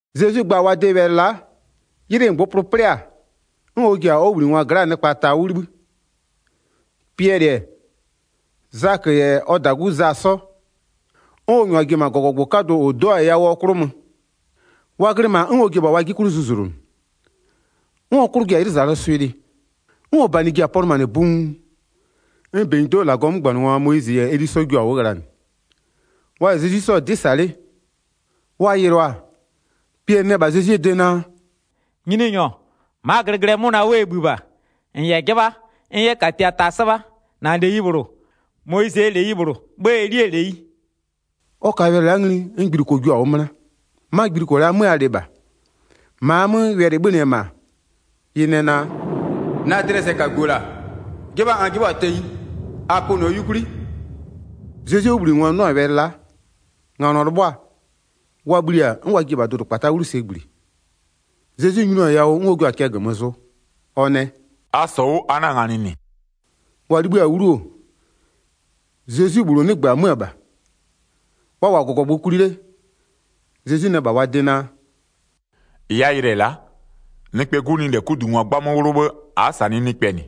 Zezwi gba-a wa de wɛlɩ la'a, 'ylɩ -ngbʋpʋlʋ 'plɩ-a, 'n ɔ ji-a ɔ 'wʋbhlinɩngwa gla'aa nɩkpa ta 'wʋ 'libhï. Piɛlɩ-ɛ, Zakö -yɛ ɔ -dagu Za 'sɔ, 'n ɔ -nyʋa ji-e -ma -gɔgɔgbʋ 'kadʋ -ʋ 'do-a yawʋɔ 'klʋ mö. Wa glɩ -ma 'n ɔ ji-e -bha wa 'jie 'klʋ zuzlonʋ, 'n ɔ 'klʋ ji-a 'ylʋzalʋɔ swɩ'ɩ lɩ, 'n ɔ -banɩ ji-a pɔlʋmanɩ buun. 'N -benyido'oo -Lagɔɔ 'mögbanɩngwa, Moyizɩ -yɛ Eli 'sɔ jua-a 'wʋ ghlanɩ, wa -yɛ Zezwi 'sɔ-ɔ 'dɩ -sa 'le. Wa yɩlʋa-a, Piɛlɩ nɛ -bha Zezwie de naa: “Nyininyɔ, ma'aa glɩglɩɛ 'mʋna 'wʋ ɛ -bhï -bha. -N -yɛ 'jɩbha, n 'yɛ -katia ta 'sɩbha. -Na -leyi -bhlʋ, Moyizɩɛ -leyi -bhlʋ 'bhë Elie -leyi.” Ɔ ka wɛlɩ la'a ngli, 'n gbiluko jua-a 'wʋ 'möna, 'ma gbiluko la'a 'mö a lɩ -bha. -Ma a 'mö wɛlɩ-ɩ 'bhönɩ-ɛ -ma, ɩ nɛ naa: “Na dlɩɛ sɛkagu-o -la, 'jɩbha n 'jɩbhɔ-a tenyi, a pönɩɔ 'yukwli.” Zezwie 'wʋbhlinɩngwa 'nʋ-a wɛlɩ la'a, nganɔ 'lɩbhʋa-a, wa bhli-a 'n wa ji-e -bha dʋdʋkpata'a dlɩ sɛ -gbli. Zezwi nyinʋa-a yawʋ 'n ɔ jua-a cɛ -gömö zʋ, ɔ nɛ: “A -sɔ 'wʋ, a 'na-a nganɩ -nɩ.” Wa 'libhï-a 'wlu-o, Zezwi -bhlʋ 'nɩgbö-ö 'mö-ö -bha. Wa -wʋ-a -gɔgɔgbʋ kwli 'le, Zezwi nɛ -bha wa de naa: “-Ɩ a yɩlɩ-ɛ la'a, Nɩkpɛɛ 'Gu nɩ -lɛ 'kudungwa 'gbamö 'wlʋ 'bhë, a'a -sanɩɩ nɩkpɛ -nɩ.”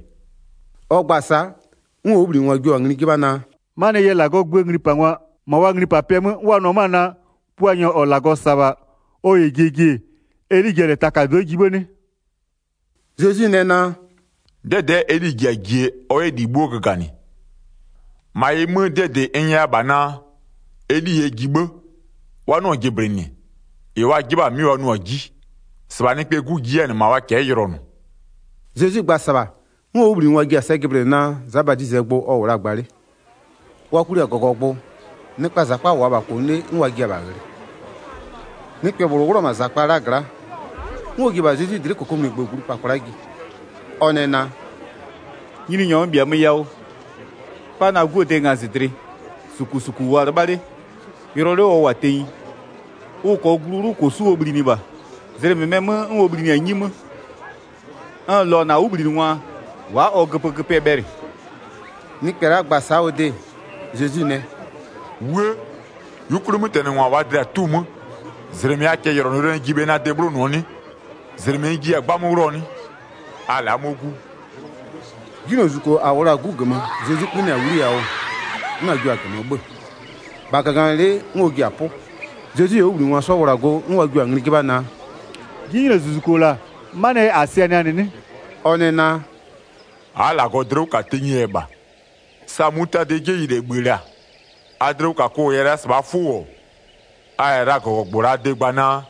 Ɔ gba-a sa'a, 'n ɔ 'wʋbhlinɩngwa jio-a ngli 'jɩbha naa: “'Manɩɛ yɛ -Lagɔɔ gböö nglipangwa -ma wa nglipapɩɛ 'mö 'n wa nʋ-ɔ 'mö-ö naa, Puanyɔ -ɔ -Lagɔ -sa-a -bha ɔ -yɛ jie ji-e, Eli ji-a -lɛ takado'o jie 'bhë 'nɩ?” Zezwi nɛ naa: “'Dɛdɛ'ɛ Eli ji-a jie, ɔ 'yɛ -li 'bhuo göganɩ. 12-Ma ɩ 'mö, 'dɩɛ -dɩ n nyɛya -bha naa: Eli yɛ ji 'bhë, wa 'nɩɔ-ɔ jɩblɩnɩ, -ɩ wa 'jɩbha-a 'mɩ wa nʋɔ-a 'ji, -sɩbha Nɩkpɛɛ 'Gu ji 'yɛ-a -nɩ -ma wa cɛ'ɛ yʋlɔnʋɔ.” Zezwi gba-a -sɩbha, 'n ɔ 'wʋbhlinɩngwa ji-a sɛ jɩblɩnɩ naa, Za Badizɩɛ gbʋ ɔ -wʋ la-a gba 'le. Wa kwli-a -gɔgɔgbʋ, nɩkpaa -zakpa -wʋ-a -bha -kʋnʋ 'le 'n wa jia-a -bha ghlɩ. Nɩkpɛ -bhlʋ 'wlʋ-ɔ -ma -zakpa la'a gla'a, 'n ɔ ji-e -bha Zezwi dlɩ'ɩ -kokomunigbö glu -pa kwla'a ji. Ɔ nɛ naa: “Nyininyɔ n -bhiamö yawʋ, 'pa na 'guo de ngazɩdlɩ, -sukusuku -wʋɔ-a 'lɩbha 'le, yʋlɔ 'le ɔ -wʋ-a tenyi, ʋ -kɔɔ glu 'wlʋ -kosu'u ɔ bhlinɩ -bha, zlɩ -mɩmɛɛ 'mö 'n ɔ bhlinɩ-a 'nyi 'mö. N -lɔɔ-ɔ -na 'wʋbhlinɩngwa wa'a ɔ göpögöpɩɛ bhɛlɩ.” Nɩkpɛ la'a gba-a sa'a ɔ de, Zezwi nɛ: “'Wuë! 'Yukwlimötɛnɩngwa -waa dlɩa-a 'tu-u 'mö, -zlɩmɩ a cɛyʋlɔnʋyʋlɔnʋɛ ji bhe na de 'bhlonʋɔ 'nɩ? -Zlɩmɩ n jiya-a 'gbamö 'wlʋɔ 'nɩ? A la'a 'mɔ 'gu.” 'Jinylozuzuko -a -wʋ la-a 'gu -gömö, Zezwi 'kpönɩa-a 'wliyawʋ, 'n a jio-a -gömö 'bhö-ö, -bha -gaganɩlɩ'ɩ, 'n ɔ ji-a 'pʋ. Zezwi -yɛ ɔ 'wʋbhlinɩngwa wla-a go, 'n wa jio-a ngli 'jɩbha naa: “'Jinylozuzuko -la 'manɩɛ yɛ -a sɩanɩa-a -nɩ 'nɩ?” Ɔ nɛ naa: “A'a -Lagɔ dlɩ 'wʋ -ka tenyie yɛ -bha. Sa mutadɩɛ 'jeyi -lɛ -bhï-ë -la, a dlɩwʋkakʋ -yɛ la -sɩbhaa 'fʋ -wʋ-ɔ, a -yɛ la -gɔgɔgbʋɔ -laa de gba naa,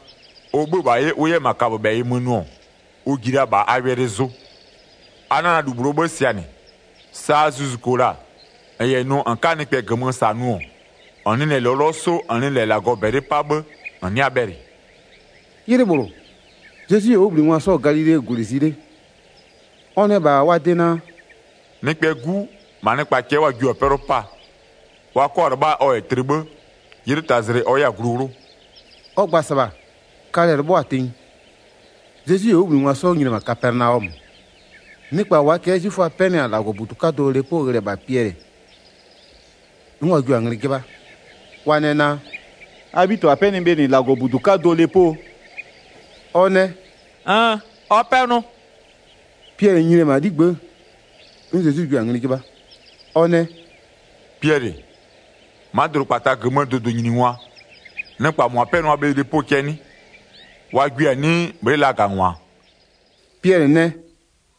ʋ 'bhö-ö -la 'ye ʋ 'yɛ -ma kaböbhɛyɩ mö nʋ-ɔ, ʋ ji la -bha a wɛlɩ zʋ. A 'na la -lu -bhlʋɔ 'bhë sɩanɩ. [ 21-Saa zuzuko -la -n -yɛ nʋ -n 'ka nɩkpɛ -gömö -sa nʋ-ɔ, -n nɩ lɔlɔ 'sʋ -n nɩ -lɛ -Lagɔ -bɛlɩ 'pa 'bhë, -n 'nɩa bhɛlɩ.”] 'Ylɩ -bhlʋ, Zezwi -yɛ ɔ 'wʋbhlinɩngwa 'sɔ-ɔ Galilee -gwlɩ zi 'le, ɔ nɛ -bha wa de naa: “Nɩkpɛɛ 'Gu, -ma nɩkpa cɛ'ɛ wa jio-a 'pɛlʋ 'paa. Wa 'kɔ-a 'lɩbha ɔ -yɛ tlɩ 'bhë, 'ylɩ tazlɩ ɔ 'yɛ-a glu 'wlʋ.” Ɔ gba-a -sɩbha, kalɛ-ɛ 'lɩbhʋa-a tenyi. Zezwi -yɛ ɔ 'wʋbhlinɩngwa 'sɔ nyini-e -ma Kapɛnaɔmö, nɩkpa -waa cɛ'ɛ 'zwiföa 'pɛnɩ-a -Lagɔbudu 'kadʋɔ lepo ghlɩɛ -bha Piɛlɩ, 'n wa jio-a ngli 'jɩbha, wa nɛ naa: “A 'bhitɩbha 'pɛnɩ bhe -nɩ -Lagɔbudu 'kadʋɔ lepo?” Ɔ nɛ: “Nn! Ɔ pɛnʋ.” Piɛlɩ nyini-e -ma 'ligbë'ë, 'n Zezwi jio-a ngli 'jɩbha. Ɔ nɛ: “Piɛlɩ, ma'a dʋdʋkpata -gömöö dʋdʋnyiningwa, nɩkpa -mʋa 'pɛnʋa bhe lepo cɛ'ɛ 'nɩ? Wa gwie-a 'nɩɩ, bhlɩ'ɩ lagangwa-a?” Piɛlɩ nɛ: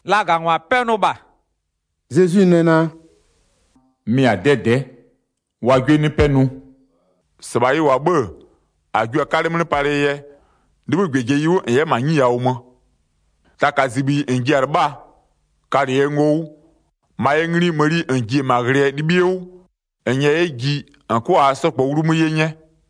“Lagangwa 'pɛnʋ -bha.” Zezwi nɛ naa: “Mɩ-a 'dɛdɛ'ɛ, wa 'gwie 'nɩ 'pɛnʋ. 27-Sɩbha ɩ -wʋ-a 'bhë-ë, -a jua-a 'kalɛ 'mlɩ palɩɛ yɛ, 'libhï -gbɛjeyi 'wʋ -n 'yɛ -ma 'nyi yawʋ mö. Taka -zibhiyi -n ji-a 'lɩbhaa, kalɩ ɛ ngo 'wʋ, -ma ɛ ngli mëni -n ji-e -ma ghlɩɛ 'libhie 'wʋ, -n -nyɛɛ 'yɛ ji, -n 'kʋa -aa 'sɔ -kpɔɔ 'wlumö 'ye 'nyɛ.”